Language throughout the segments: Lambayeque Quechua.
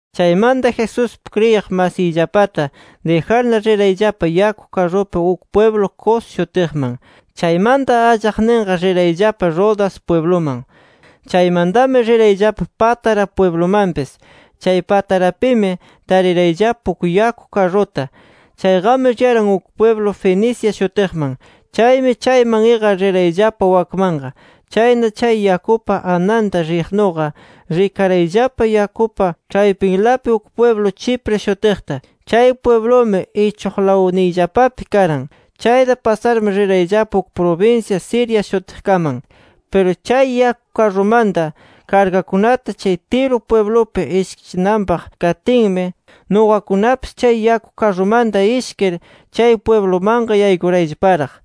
Chaymanta Jesuspi kriyiq masiyllapata dijarna rirayllapa yaku karrupi uk pwiblu Cos shutiqman. Chaymanta allaqninqa, rirayllapa Rodas pwibluman. Chaymantami rirayllapa Pátara pwiblumanpis. Chay Patarapimi, tarirayllapa uk yaku karruta. Chayqami riyaran uk pwiblu Fenicia shutiqman. Chaymi, chayman iqar rirayllapa wakmanqa. Chayna chay yakupa ananta riqnuqa, rikarayllapa yakupa ĉhaypinlapi uk pwiblu Chipre shutiqta. Chay pwiblumi, ichuqlawniyllapapi karan. Chayta pasarmi rirayllapa uk prubinsya Siria shutiqkaman. Piru chay yaku karrumanta kargakunata chay Tiro pwiblupi ishkichinanpaq katinmi, nuqakunapis chay yaku karrumanta ishkir chay pwiblumanqa yaykurayllaparaq.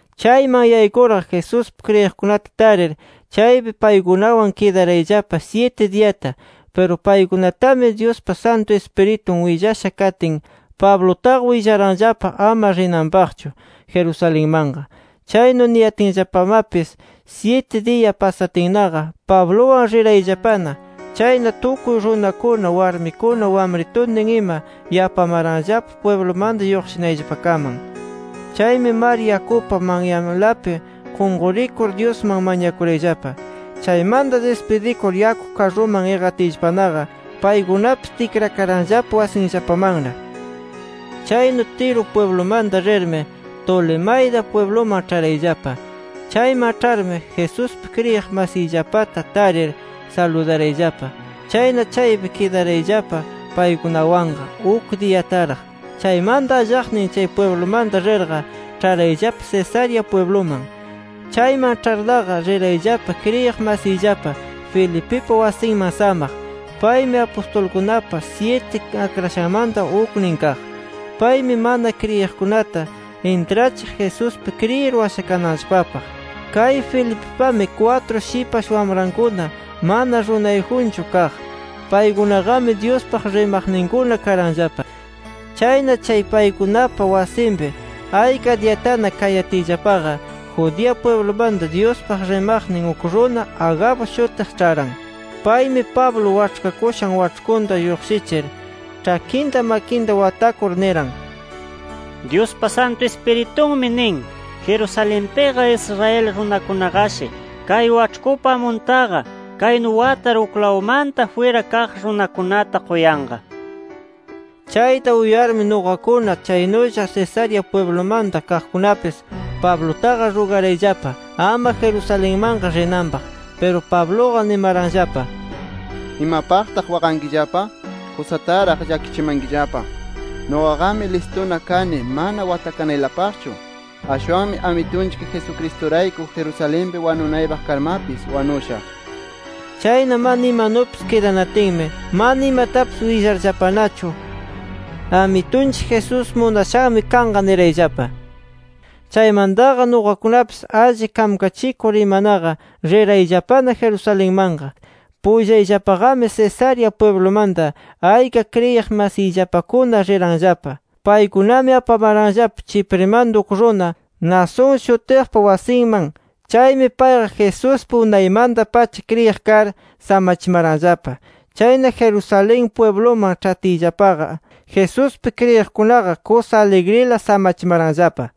Chayman yaykurqa, Jesuspi kriyiqkunata tarir chaypi paykunawan kidarayllapa syiti diyata. Piru paykunatami, Dyuspa Santu Ispiritun willasha katin, Pablutaqa willaranllapa ama rinanpaqchu Jerusalenmanqa. Chaynu niyatinllapamapis, syiti diya pasatinnaqa Pabluwan rirayllapana. Chayna tukuy runakuna, warmikuna wamrituntin ima yapamaranllapa pwiblumanta lluqshinayllapakaman. Chaymi, mar yakupa manyanlapi qunqurikur Dyusman mañakurayllapa. Chaymanta dispidikur yaku karruman iqatiyllapanaqa, paykunapis tikrakaranllapa wasinllapamanna. Chaynu Tiro pwiblumanta rirmi, Tolemaida pwibluman ĉharayllapa. Chayman ĉharmi, Jesuspi kriyiq masiyllapata tarir saludarayllapa. Chayna chaypi kidarayllapa paykunawanqa uk diyataraq. Chaymanta allaqnin chay pwiblumanta rirqa, ĉharayllapa Cesarea pwibluman. Chayman ĉharnaqa, rirayllapa kriyiq masiyllapa Felipipa wasinman samaq. Paymi apustulkunapa syiti akrashanmanta uknin kaq. Paymi mana kriyiqkunata intrachiq Jesuspi kriyir washakananllapapaq. Kay Felipipami, kwatru shipash wamrankuna mana runayjunchu kaq. Paykunaqami Dyuspaq rimaqninkuna karanllapa. Chayna, chay paykunapa wasinpi ayka diyatana kayatiyllapaqa, Judea pwiblumanta Dyuspaq rimaqnin uk runa Agabo shutiq ĉharan. Paymi, Pablo waĉhkakushan waĉhkunta lluqshichir ĉhakinta, makinta watakur niran: —Dyuspa Santu Ispiritunmi nin, Jerusalenpiqa Israel runakunaqashi kay waĉhkupa amuntaqa, kaynu watar uklawmanta jwira kaq runakunata quyanqa nir. Chayta uyarmi, nuqakuna, chaynulla Cesarea pwiblumanta kaqkunapis, Pablutaqa rugarayllapa ama Jerusalenmanqa rinanpaq. Piru Pabluqa nimaranllapa: —¿Imapaqtaq waqankillapa? Kusataraq llakichimankillapa. Nuqaqami listuna kani mana watakanaylapaqchu. Ashwanmi Amitunchik Jesucristurayku Jerusalenpi wanuypaq karmapis, wanushaq. Chayna mana imanupis kidanatinmi, mana imatapis willarllapanachu, “Amitunchik Jesús munashanmi kanqa” nirayllapa. Chaymantaqa nuqakunapis alli kamkachikur imanaqa, rirayllapana Jerusalenmanqa. Pullayllapaqami Cesarea pwiblumanta ayka kriyiq masiyllapakuna riranllapa. Paykunami apamaranllapa Chiprimanta uk runa Mnasón shutiqpa wasinman. Chaymi payqa Jesuspi unaymanta-pacha kriyiq kar samachimaranllapa. Chayna, Jerusalén pwibluman ĉhatiyllapaqa, Jesuspi kriyiqkunaqa kusa aligrila samachimaranllapa.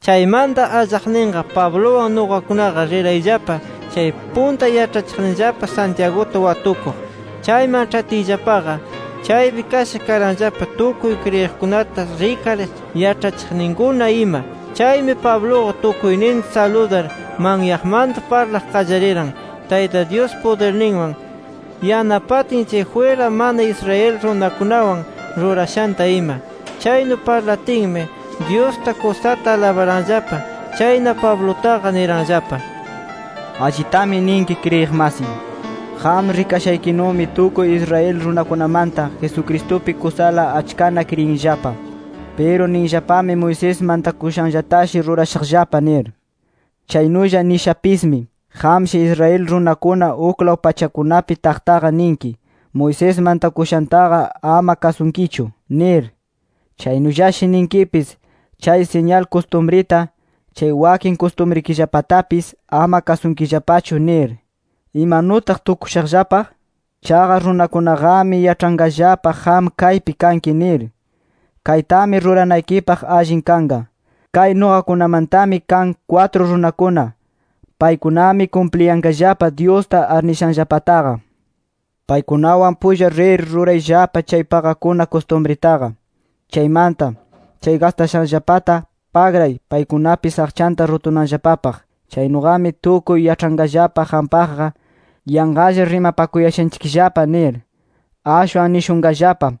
Chaymanta allaqninqa, Pabluwan nuqakunaqa rirayllapa chay punta yaĉhachiqninllapa Santiaguta watukuq. Chayman ĉhatiyllapaqa chaypi kasha karanllapa tukuy kriyiqkunata rikar yaĉhachiqninkuna ima. Chaymi, Pabluqa tukuyninta saludar manyaqmanta parlaq qallariran, Tayta Dyus pudirninwan yanapatin chay jwira mana Israel runakunawan rurashanta ima. Chaynu parlatinmi, Dyusta kusata alabaranllapa. Chayna, Pablutaqa niranllapa: “Allitami ninki kriyiq masiy. Qam rikashaykinumi tukuy Israel runakunamanta, Jesucristupi kusala achkana kriyinllapa. Piru ninllapami Moisés mantakushanllatashi rurashaqllapa nir. Chaynulla nishapismi, qamshi Israel runakuna uklaw pachakunapi taqtaqa ninki: ‘Moisés mantakushantaqa ama kasunkichu’ nir. Chaynullashi ninkipis: ‘Chay siñal kustumrita, chay wakin kustumrikillapatapis ama kasunkillapachu’ nir. ¿Imanutaq tukushaqllapa? Chaqa runakunaqami yaĉhanqallapa qam kaypi kanki nir. Kaytami ruranaykipaq allin kanqa: Kay nuqakunamantami kan kwatru runakuna. Paykunami kumpliyanqallapa Dyusta arnishanllapataqa. Paykunawan pulla rir, rurayllapa chay paqakuna kustumritaqa. Chaymanta, chay gastashanllapata pagray, paykunapis aqchanta rutunanllapapaq. Chaynuqami tukuy yaĉhanqallapa qampaqqa ‘Yanqalla rimapakuyashanchikllapa’ nir. Ashwan nishunqallapa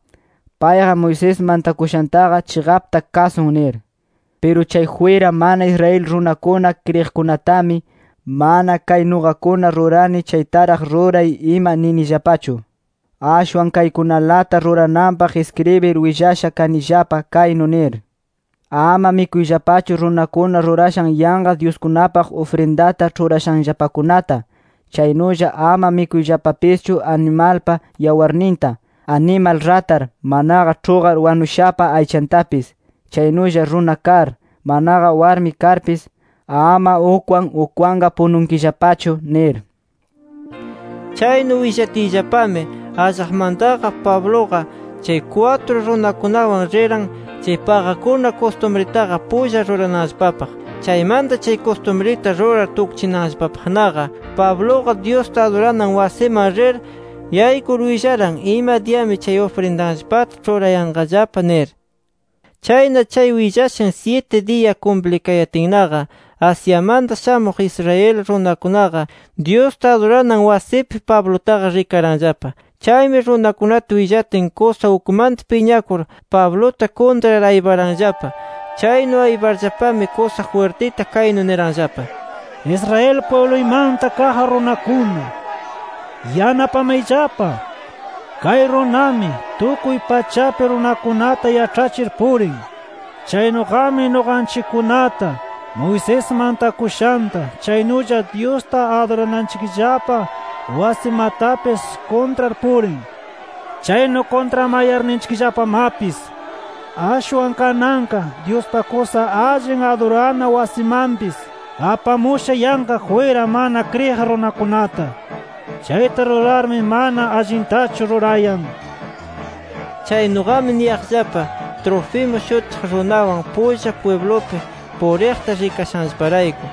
‘Payqa Moisés mantakushantaqa chiqapta kasun’ nir. “Piru chay jwira mana Israel runakuna kriyiqkunatami, mana kay nuqakuna rurani chaytaraq ruray ima ninillapachu. Ashwan kaykunalata rurananpaq iskribir willasha kanillapa kaynu nir: ‘Ama mikuyllapachu runakuna rurashan yanqa dyuskunapaq ufrindata ĉhurashanllapakunata. Chaynulla ama mikuyllapapischu animalpa yawarninta, animal ratar, manaqa ĉhuqar wanushapa aychantapis. Chaynulla runa kar, manaqa warmi karpis, ama ukwan ukwanqa pununkillapachu’ nir”. Chaynu willatinllapami, allaqmantaqa Pabluqa chay kwatru runakunawan riran, chay paqakuna kustumritaqa pulla rurananllapapaq. Chaymanta chay kustumrita rurar tukchinanllapapaqnaqa, Pabluqa Dyusta aduranan wasiman rir yaykur, willaran ima diyami chay ufrinditanllapata ĉhurayanqallapa nir. Chayna chay willashan syiti diya kumplikayatinnaqa, Asiamanta shamuq Israel runakunaqa, Dyusta aduranan wasipi Pablutaqa rikaranllapa. Chaymi runakunata willatin, kusa ukmanta piñakur, Pabluta kuntrar ayparanllapa. Chaynu ayparllapami, kusa jwirtita kaynu niranllapa: “Israel pwibluymanta kaq runakuna, ¡yanapamayllapa! Kay runami, tukuy pachapi runakunata yaĉhachir purin. Chaynuqami nuqanchikkunata, Moisés mantakushanta, chaynulla Dyusta adurananchikllapa wasimatapis kuntrar purin. Chaynu kuntramayarninchikllapamapis, ashwan kananqa Dyuspa kusa allin adurana wasimanpis, apamusha yanqa jwira mana kriyiq runakunata. Chayta rurarmi mana allintachu rurayan” nir. Chaynuqami niyaqllapa, Trófimo shutiq runawan pulla pwiblupi puriqta rikashanllaparayku.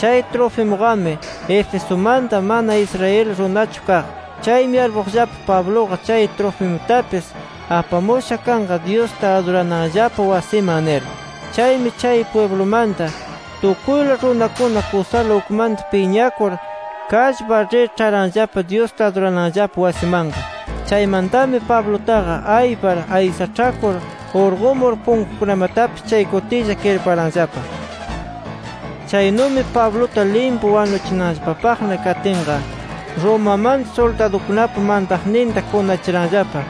Chay Trofimuqami Efesumanta, mana Israel runachu kaq. Chaymi yarpuqllapa, Pabluqa chay Trofimutapis apamusha kanqa Dyusta adurananllapa wasiman nir. Chaymi chay pwiblumanta tukuyla runakuna kusala ukmanta piñakur, kallpar rir ĉharanllapa Dyusta adurananllapa wasimanqa. Chaymantami Pablutaqa aypar aysaĉhakur urqumur, punkukunamatapis chay kutilla kirparanllapa. Chaynumi Pabluta limpu wanuchinanllapapaqna katinqa, Romamanta suldadukunapa mantaqninta kunachiranllapa,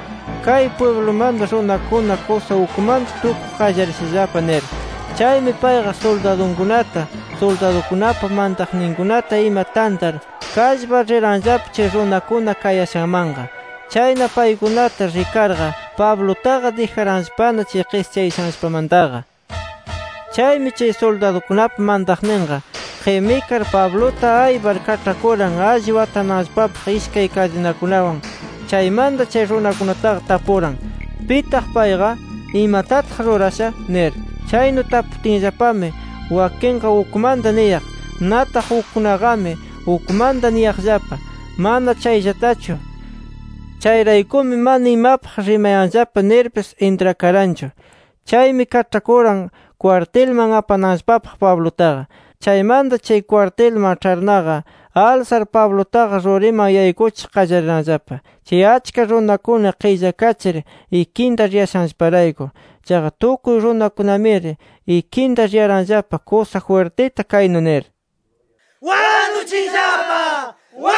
kay pwiblumanta runakuna kusa ukmanta tukuq qallarishallapa nir. Chaymi payqa suldadunkunata, suldadukunapa mantaqninkunata ima tantar, kallpar riranllapa chay runakuna kayashanmanqa. Chayna paykunata rikarqa, Pablutaqa dijaranllapana chay qischayashanllapamantaqa. Chaymi chay suldadukunapa mantaqninqa qimikar, Pabluta aypar kaĉhakuran alli watananllapapaq ishkay kadinakunawan. Chaymanta chay runakunataqa tapuran: “¿Pitaq payqa, imatataq rurasha?” nir. Chaynu taputinllapami wakinqa ukmanta niyaq. Nataq ukkunaqami ukmanta niyaqllapa, mana chayllatachu. Chayraykumi mana imapaq rimayanllapa nirpis intrakaranchu. Chaymi, kaĉhakuran kwartilman apananllapapaq Pablutaqa. Chaymanta chay kwartilman ĉharnaqa, alsar Pablutaqa ruriman yaykuchiq qallariranllapa, chay achka runakuna qillakachir ikinta riyashanllaparayku. Chaqa tukuy runakunamiri ikinta riyaranllapa, kusa jwirtita kaynu nir: “¡Wanuchiyllapa!”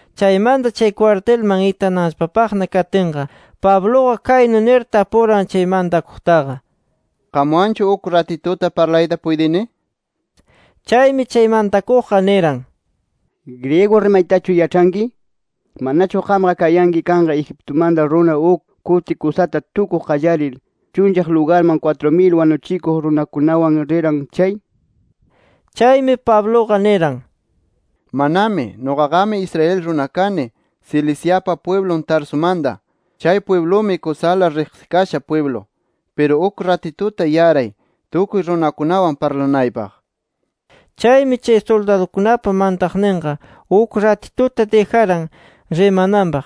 Chaymanta, chay kwartilman itananllapapaqna katinqa, Pabluqa kaynu nir tapuran chay mantakuqtaqa: —¿Qamwanchu uk ratituta parlayta puytini? nir. Chaymi, chay mantakuqqa niran: —¿Griego rimaytachu yaĉhanki? ¿Manachu qamqa kayanki kanqa Egiptumanta runa uk kuti kusata tukuq qallarir, chunllaq lugarman kwatru mil wanuchikuq runakunawan riran chay? nir. Chaymi, Pabluqa niran: —Manami. Nuqaqami Israel runa kani, Ciliciapa pwiblun Tarsumanta. Chay pwiblumi kusala riqsikasha pwiblu. Piru uk ratituta yaray, tukuy runakunawan parlanaypaq. Chaymi, chay suldadukunapa mantaqninqa uk ratituta dijaran rimananpaq.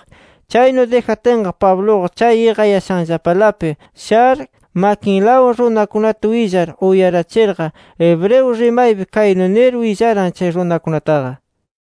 Chaynu dijatinqa Pabluqa chay iqayashanllapalapi shar, makinlawan runakunata willar uyarachirqa, hebreo rimaypi kaynu nir willaran chay runakunataqa.